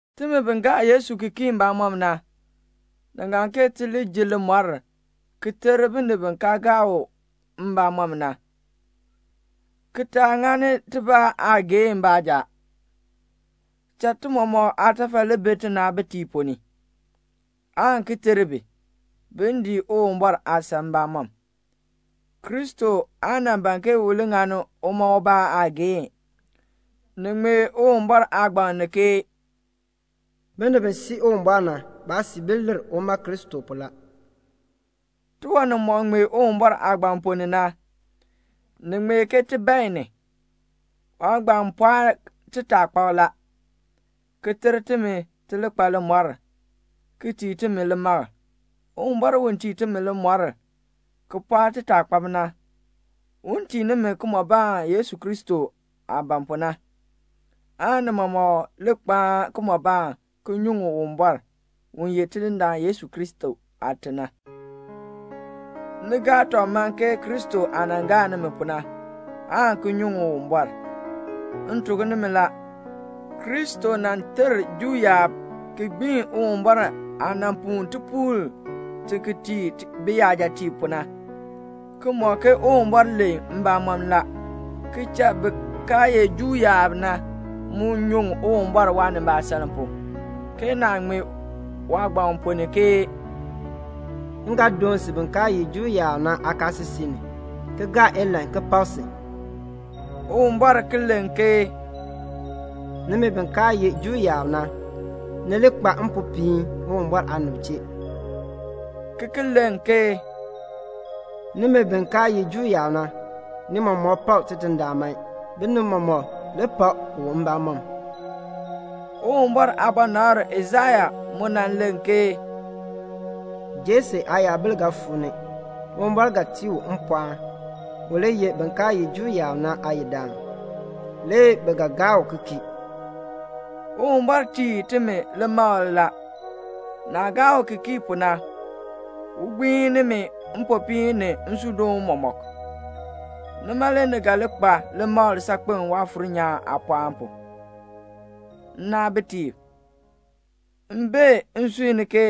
Timi bi gaa Yesu ki kii mbamɔm na, ni ŋan ke ti li ji limɔr, ki ter binib bi kaa gaa u mbamɔm na, ki taa ŋani tibaa aageehn baanja. Cha ti mɔmɔk aatafal li bi tinaabitiib ponn ni, aan ki ter bi, bin dii Uwumbɔr aasan mbamɔm. Kristo aa nan ban ke u li ŋani uma ubaa aageehn. Ni ŋmee Uwumbɔr Aagbaŋ ni ke "Binib bi sii Uwumbɔr na, baasiibil lir uma Kristo pu la." Tiwan nimɔk ŋmee Uwumbɔr Aagbaŋ ponn ni na, ni ŋmee ke ti bae ni. Waagbaŋ pɔɔni timi aataakpab la, ki ter timi ti li kpa limɔr, ki tii timi limakl. Uwumbɔr u tii timi limɔr, ki pɔɔk timi aataakpab na, un tii nimi kimɔbaan Yesu Kristo aah ban pu na, aan ni mɔmɔk li kpaan kimɔbaan ki nyuŋ Uwumbɔr, u ye Tidindaan Yesu Kristo aate na. Ni gaa tɔb man ke Kristo aah nan gaa nimi pu na, aan ki nyuŋ Uwumbɔr. M tuk nimi la, Kristo nan ter Juu yaab ki gbiin Uwumbɔr aah nan puu tipuul ki tii biyajatiib pu na, ki mɔk ke Uwumbɔr len mbamɔn la, ki cha bin kaa ye Juu yaab na mu nyuŋ Uwumbɔr waanimbaasaln pu, ke naah ŋmee waagbaŋ ponn ni ke "M ga doon si bin kaa ye Juu yaab na aakaasisik ni, ki gaa ilahn ki pak si." Uwumbɔr ki len ke "Nimi bin kaa ye Juu yaab na, ni li kpa mpopiin Uwumbɔr aanib chee." ki ki len ke "Nimi bin kaa ye Juu yaab na, ni mɔmɔk pak Tidindaan man. Binib mɔmɔk, li pak u mbamɔm." Uwumbɔr aabɔnabr Aisaya mu nan len ke "Jese aayabil ga fuu ni. Uwumbɔr ga tii u mpɔɔn, u li ye bin kaa ye Juu yaab na aayidaan. Le bi ga gaa u ki kii." Uwumbɔr tii timi limakl la. Naah gaa u ki kii pu na, un gbiin nimi mpopiin ni nsuudoon mɔmɔk. Nima le ni ga li kpa limakl saakpen Waafuur nyaan aapɔɔn pu. Nnaabitiib, m bee nsui ni ke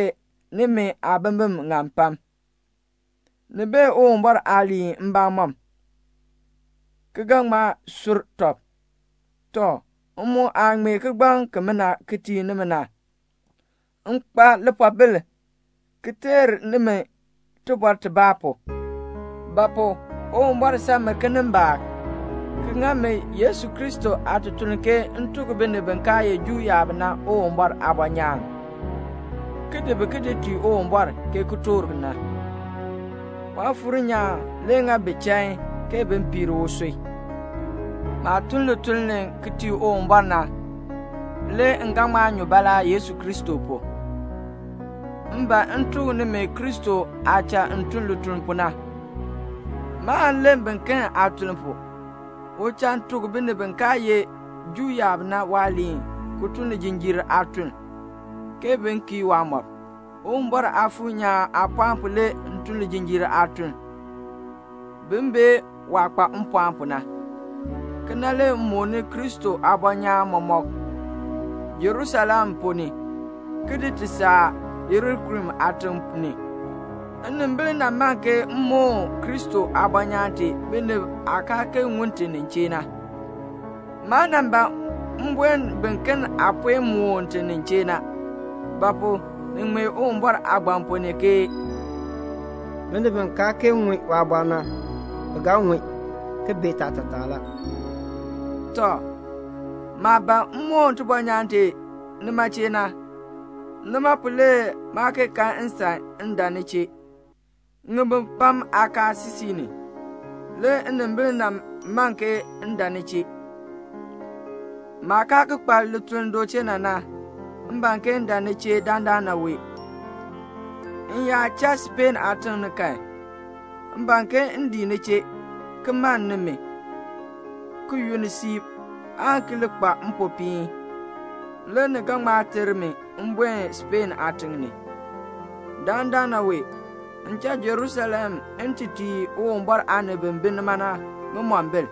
nimi aabimbin ŋan pam. Ni bee Uwumbɔr aaliin mbamɔm, ki ga ŋma sur tɔb. Tɔ, m mu aah ŋmee kigbaŋ kimina ki tii nimi na, m kpa lipoobil ki teer nimi tibɔr tibaa pu; ba pu? Uwumbɔr san mi kinimbaak, ki ŋa mi Yesu Kristo aatutuln ke m tuk binib bi kaa ye Juu yaab na Uwumbɔr aabɔnyaan, ki di bi ki di tii Uwumbɔr, ke kitork na. Waafuur nyaan le ŋa bi chain ke bin piir usui. Maah tun lituln ki tii Uwumbɔr na, le m ga ŋma nyu baalaa Yesu Kristo pu. M ban m tuk nimi Kristo aah cha m tun lituln pu na. Maan len biken aatuln pu. U cha m tuk binib bi kaa ye Juu yaab na waaliin ki tun lijinjiir aatun, ke bin kii waamɔb. Uwumbɔr Aafuur nyaan aapɔɔn pu le m tun lijinjiir aatun, bin bee waah kpa mpɔɔn pu na. Kena le m mooni Kristo aabɔnyaan mɔmɔk Jerusalem ponn ni, ki di ti saa Ilirikum aatiŋ ni. Nnimbil nan man ke m moon Kristo aabɔnyaan tee binib aah kaa kee ŋun ti nin chee na. Maa nan ban m buen biken aah puen moon ti nin chee na. Ba pu? ni ŋmee Uwumbɔr Aagbaŋ ponn ni ke "Binib bi kaa kee ŋun waabɔr na, bi ga ŋun, ki bee taatataa la." Tɔ, maah ban m moon tibɔnyaan tee nima chee na, nima pu na le maa kee kan nsan ke m dan ni chee. Ŋibin pam aakaasisik ni, le nnimbil man ke m dan ni chee. Maah kaa ki kpa lituln du chee na na, m ban ke m dan ni chee dandana wee la. M yaa cha Speen aatiŋ ni kan, m ban ke m dii ni chee, ki mann nimi, ki yunn siib, aan ki li kpa mpopiin. Le ni ga ŋma ter mi m buen Speen aatiŋ ni. Dandana wee, m cha Jerusalem m ti tii Uwumbɔr aanib bi bi nima na ŋimombil.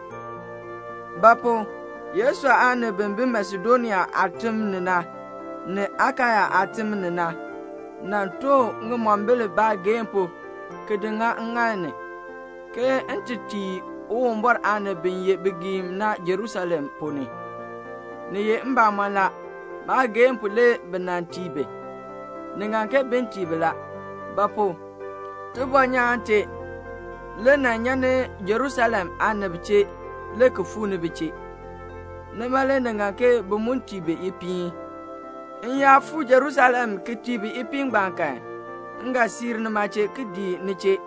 Ba pu? Yesu aanib bi bi Masedonia aatim ni na, ni Akaya aatim ni na, nan too ŋimombil baageehn pu ki di ŋa ŋŋaal ni, ke m ti tii Uwumbɔr aanib bi ye bigiim na Jerusalem ponn ni. Ni ye mbamɔn la, baageehn pu le bi nan tii bi. Ni ŋan ke bin tii bi la; ba pu? tibɔnyaan tee le nan nyan ni Jerusalem aanib chee le ki fuu ni bi chee. Nima le ni ŋan ke bi mu tii bi ipiin. M yaa fuu Jerusalem ki tii bi ipiin ngbaan kan, m ga siir nima chee, ki dii ni chee,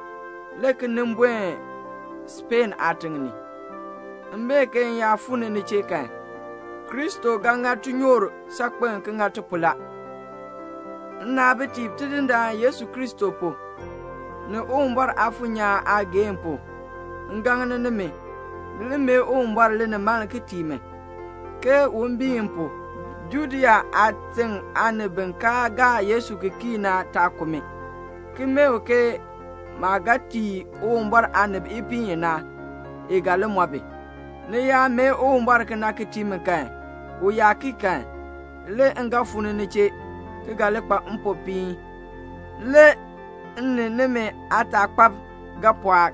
le ki nin buen Speen aatiŋ ni. M bee ke m yaa fuu ni ni chee kan, Kristo ga ŋa tinyoor saakpen ki ŋa ti pu la. Nnaabitiib, Tidindaan Yesu Kristo pu, ni Uwumbɔr Aafuur nyaan aageehn pu, m gaŋ nimi, ni li mee Uwumbɔr linimaln ki tii mi, ke un biin m pu, Judea aatiŋ aanib bi kaa gaa Yesu ki kii na taa ku mi, ki mee u ke maah ga tii Uwumbɔr aanib ipiin i na, i ga li mɔ bi. Ni yaa mee Uwumbɔr kena ki tii mi kan, u yaa kii kan, le m ga fuu ni ni chee, ki ga li kpa mpopiin. Le m ni nimi aataakpab ga pɔɔk.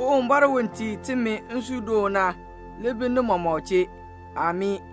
Uwumbɔr u tii timi nsuudoon na li bi ni mɔmɔk chee. Amii.